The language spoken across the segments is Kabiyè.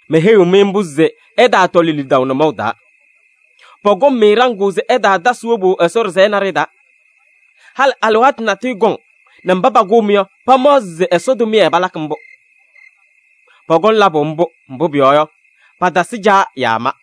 Meheyiɣ-mɩ mbʋ se ɩtaatɔlɩ lidaʋ nʋmɔʋ taa. Pɔkɔŋ-mɩ ɖaŋʋʋ se ɩtaatasɩ wobu Ɛsɔ ɖɩsɛyɛ naɖɩyɛ taa. Halɩ alɩwaatʋ natʋyʋ kɔŋ nɛ mba pakʋʋ-mɩ yɔ, pamaɣzɩ se Ɛsɔ tʋmɩyɛ palakɩ mbʋ. Pɔkɔŋ labʋ mbʋ, mbʋ pʋyɔɔ yɔ, patasɩ Caa yaa ma.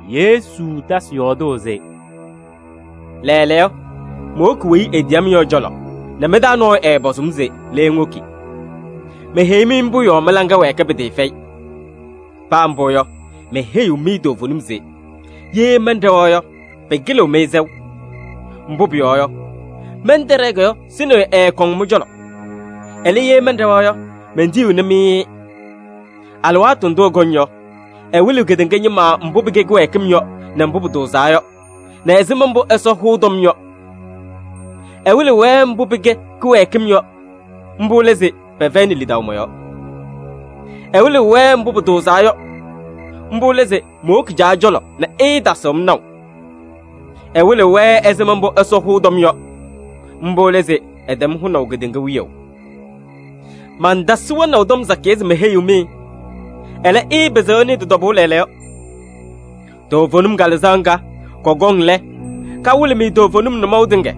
Yesu tasɩ yɔɔdʋʋ se: “Lɛɛlɛɛyɔ, mowoki weyi etiyi-m yɔ ɛ-cɔlɔ nɛ mɩ-taa nɔɔyʋ ɛɛpɔzʋʋ-m se: ‘Le ŋwoki?’ Meheyi-mɩ mbʋ yɔɔ mɩ-laŋa wɛɛkɩ pɩtɩɩfɛyɩ. Paa mbʋ yɔ, meheyiɣ-mɩ toovenim se: ye mɛnɖɛwa yɔ, pɩkɩlɩɣ-mɩ sɛʋ. Mbʋ pʋyɔɔ yɔ, mɛntɛɖɛɛ yɔ, Sɩnɩyʋ ɛɛkɔŋ mɩ-cɔlɔ. Ɛlɛ, ye mɛnɖɛwa yɔ, mentiyiɣni-mɩ-ɩ. Alɩwaatʋ ndʋ ɛkɔŋ yɔ, ɛwɩlɩɣ kedeŋa ñɩma mbʋ pɩkɛ kɩwɛɛkɩm yɔ nɛ mbʋ pʋtʋʋzaa yɔ nɛ ɛzɩma mbʋ Ɛsɔ hʋʋ tɔm yɔ. Ɛwɩlɩɣ-wɛ mbʋ pɩkɛ kɩwɛɛkɩm yɔ, mbʋ lɛ se pɛfɛyɩnɩ lidaʋ mɔ-yɔɔ. Ɛwɩlɩɣ-wɛ mbʋ pʋtʋʋzaa yɔ, mbʋ lɛ se mowoki Caa cɔlɔ nɛ ɩɩtasɩɣ-m naʋ. Ɛwɩlɩɣ-wɛ ɛzɩma mbʋ Ɛsɔ hʋʋ tɔm yɔ, mbʋ lɛ se ɛtɛm hʋnaʋ kedeŋa wiyaʋ. Mantasɩ wɛnaʋ tɔm sakɩyɛ se meheyiɣ-mɩ, ɛlɛ, ɩɩpɩzɩɣ ɩnɩɩ tɩ-tɔbʋʋ lɛɛlɛɛyɔ. Toovenim Kalɩzaɣ ŋga, kɔkɔŋ lɛ, kawɩlɩ-mɩ toovenim nʋmɔʋ tɩŋa.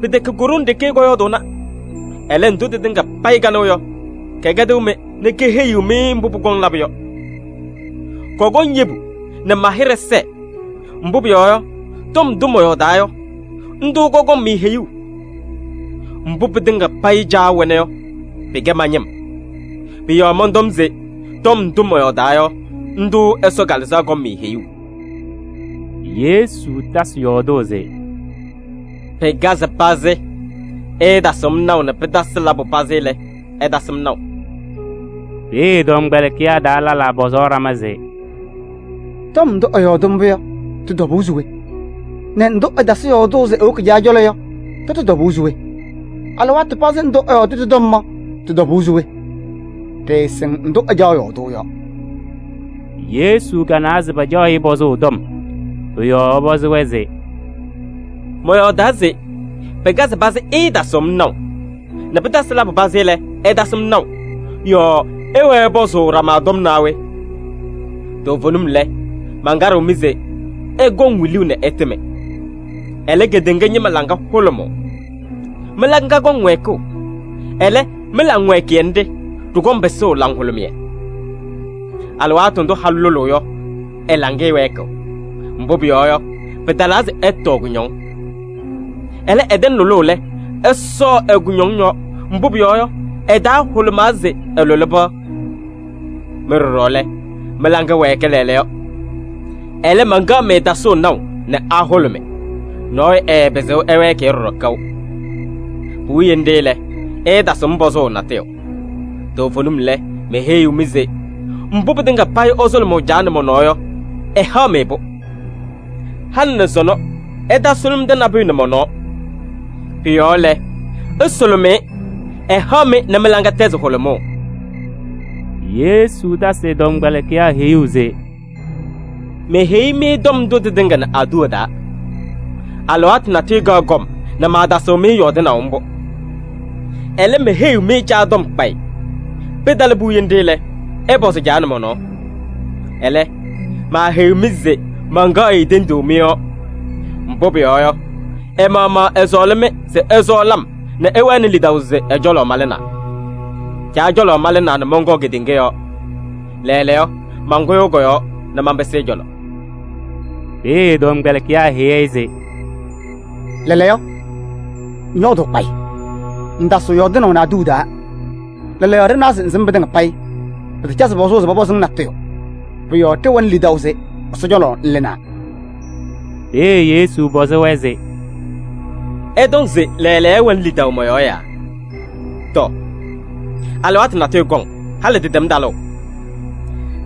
Pɩtɛkɛ ko-ɖoŋ ɖeke kɔyɔɔdʋʋna. Ɛlɛ, ndʋ tɩtɩŋa payɩ kanɩɣ yɔ, kɛkɛdɩɣ-mɩ nɛ keheyi-mɩ mbʋ pʋkɔŋ labʋ yɔ. Kɔkɔŋ yebu nɛ ma-hɩɖɛ sɛɛ, mbʋ pʋyɔɔ yɔ, tɔm ndʋ mɔyɔɔdaa yɔ, ndʋ kɔkɔŋ-mɩ heyuu. Mbʋ pɩtɩŋa payɩ Caa wɛna yɔ, pɩkɛ ma-ñɩm. Pʋ-yɔɔ mɔntɔm se tɔm ndʋ mɔyɔɔdaa yɔ, ndʋ Ɛsɔ Kalɩzaɣ kɔŋ-mɩ heyuu.” Yesu tasɩ yɔɔdʋʋ se: “Pɩkazɩ pazɩ, ɩɩtasɩɣ-m naʋ nɛ pɩtasɩ labʋ pazɩ lɛ, ɩtasɩ-m naʋ.” Peeye ɛ-tɔmkpɛlɩkɩyaa taa lɛlaa pɔzaɣ ɖama se: “Tɔm ndʋ ɛyɔɔdɩ mbʋ yɔ, tɩ-tɔbʋʋ se we? Nɛ ndʋ ɛtasɩ yɔɔdʋʋ se ewoki Caa cɔlɔ yɔ, tʋtʋ tɔbʋʋ se we? Alɩwaatʋ pazɩ ndʋ ɛyɔɔdʋʋ tɩ-tɔm yɔ, tɩ-tɔbʋʋ se we? Ɖɩɩsɩŋ ndʋ ɛcaɣ yɔɔdʋʋ yɔ.” Yesu kanawa se pacaɣ-ɩ tɔm pɔzʋʋ. Pʋ-yɔɔ ɛpɔzɩ-wɛ se: “Mɔyɔɔdaa se: ‘Pɩkazɩ pazɩ ɩɩtasɩɣ-m naʋ nɛ pɩtasɩ labʋ pazɩ lɛ, ɩtasɩ-m naʋ’ yɔɔ ɩwɛɛ ɩpɔzʋʋ ɖama tɔm naa we? Toovenim lɛ, mankaɖɩɣ-mɩ se: ɩkɔŋ wiluu nɛ ɩtɩmɩ. Ɛlɛ, kedeŋa ñɩma laŋa hʋlʋmʋʋ. Mɩ-laŋa kɔŋ wɛɛkʋʋ, ɛlɛ, mɩ-laŋwɛɛkɩyɛ nɖɩ, ɖɩkɔŋ pɩsʋʋ laŋhʋlʋmɩyɛ. Alɩwaatʋ ndʋ halʋ lʋlʋʋ yɔ, ɛ-laŋɩyɛ wɛɛkɩɣ. Mbʋ pʋyɔɔ yɔ, pɩtalaa se ɛtɔɔ kʋñɔŋ. Ɛlɛ, ɛtɛŋ lʋlʋʋ lɛ, ɛsɔɔ ɛ-kʋñɔŋ yɔɔ, mbʋ pʋyɔɔ yɔ, ɛ-taa hʋlʋmaa se ɛlʋlɩ pɩɣa. Mɩ ɖɔɖɔ lɛ, mɩ-laŋa wɛɛkɩ lɛɛlɛɛyɔ. Ɛlɛ, mankaɣ-mɩ tasʋʋ naʋ nɛ ahʋlʋmɩ, nɔɔyʋ ɛɛpɩzɩɣ ɛwɛɛkɩ-yɛ ɖɔɖɔ kaʋ. Puwiye nɖɩ lɛ, ɩɩtasɩɣ-m pɔzʋʋ natʋyʋ. Toovenim lɛ, meheyiɣ-mɩ se: mbʋ pɩtɩŋa payɩ ɩsʋlʋmʋʋ Caa nɛ mɔ-nɔɔ yɔ, ɛhaɣ-mɩ-pʋ. Halɩ nɛ sɔnɔ ɩtaasʋlʋmɩdɩ nabʋyʋ nɛ mɔ-nɔɔ. Pʋ-yɔɔ lɛ, ɩsʋlʋmɩ-ɩ, ɛhaɣ-mɩ nɛ mɩ-laŋa tɛzɩ hʋlʋmʋʋ.” Yesu tasɩ ɛ-tɔmkpɛlɩkɩyaa heyuu se: “Meheyi-mɩ tɔm ndʋ tɩtɩŋa nɛ aduwa taa. Alɩwaatʋ natʋyʋ kaɣ kɔm nɛ maatasɩɣ-mɩ yɔɔdɩnaʋ mbʋ. Ɛlɛ, meheyiɣ-mɩ Caa tɔm kpayɩ. Pɩtalɩ puwiye nɖɩ lɛ, ɩpɔzɩ Caa nɛ mɔ-nɔɔ. Ɛlɛ, maaheyiɣ-mɩ se mankaɣ-ɩ tenduu mɩ-yɔɔ. Mbʋ pʋyɔɔ yɔ, ɛ-maɣmaɣ ɛsɔɔlɩ-mɩ se ɩsɔɔlɩ-m nɛ ɩwɛnɩ lidaʋ se ɛ-cɔlɔ malɩnaa. Caa cɔlɔ malɩnaa nɛ mɔnkɔɔ kedeŋa yɔɔ. Lɛɛlɛɛyɔ, mankʋyʋʋ kɔ-yɔɔ nɛ manpɩsɩ ɛ-cɔlɔ.” Peeye ɛ-tɔmkpɛlɩkɩyaa heyi-i se: “Lɛɛlɛɛyɔ ŋyɔɔdʋʋ kpayɩ, ŋŋtasɩɣ yɔɔdʋʋnɩ aduwa taa. Lɛɛlɛɛyɔ ɖɩnawa se ŋsɩm pɩtɩŋa payɩ, pɩtacazɩ pɔzʋʋ se pɔpɔzɩ-ŋ natʋyʋ. Pʋ-yɔɔ ɖɩwɛnɩ lidaʋ se Ɛsɔ cɔlɔ ŋlɩnaa.” Peeye Yesu pɔzɩ-wɛ se: “Ɩtɔŋ se lɛɛlɛɛyɔ ɩwɛnɩ lidaʋ mɔ-yɔɔ yaa? Tɔ! Alɩwaatʋ natʋyʋ kɔŋ, halɩ tɩtɛm talʋʋ.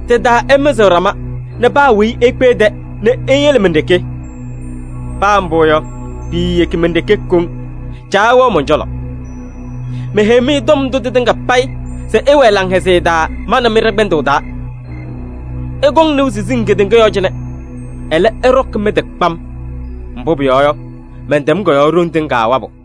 Tɩ-taa ɩmɩzɩɣ ɖama nɛ paa weyi ekpe ɛ-tɛ nɛ iyele men-ɖeke. Paa mbʋ yɔ, piiyeki men-ɖeke koŋ, Caa wɛɣ mɔn-cɔlɔ. Meheyi-mɩ tɔm ndʋ tɩtɩŋa payɩ se ɩwɛɛ laŋhɛzɩyɛ taa ma nɛ mɩ ɖɛ-kpɛndʋʋ taa. Ɩkɔŋ nɩʋ siziŋ kedeŋa yɔɔ cɩnɛ. Ɛlɛ, ɩɖɔkɩ mɩ-tɩ kpam! Mbʋ pʋyɔɔ yɔ, mɛntɛm kɔ-yɔɔ ɖoŋ tɩŋa wabʋ!”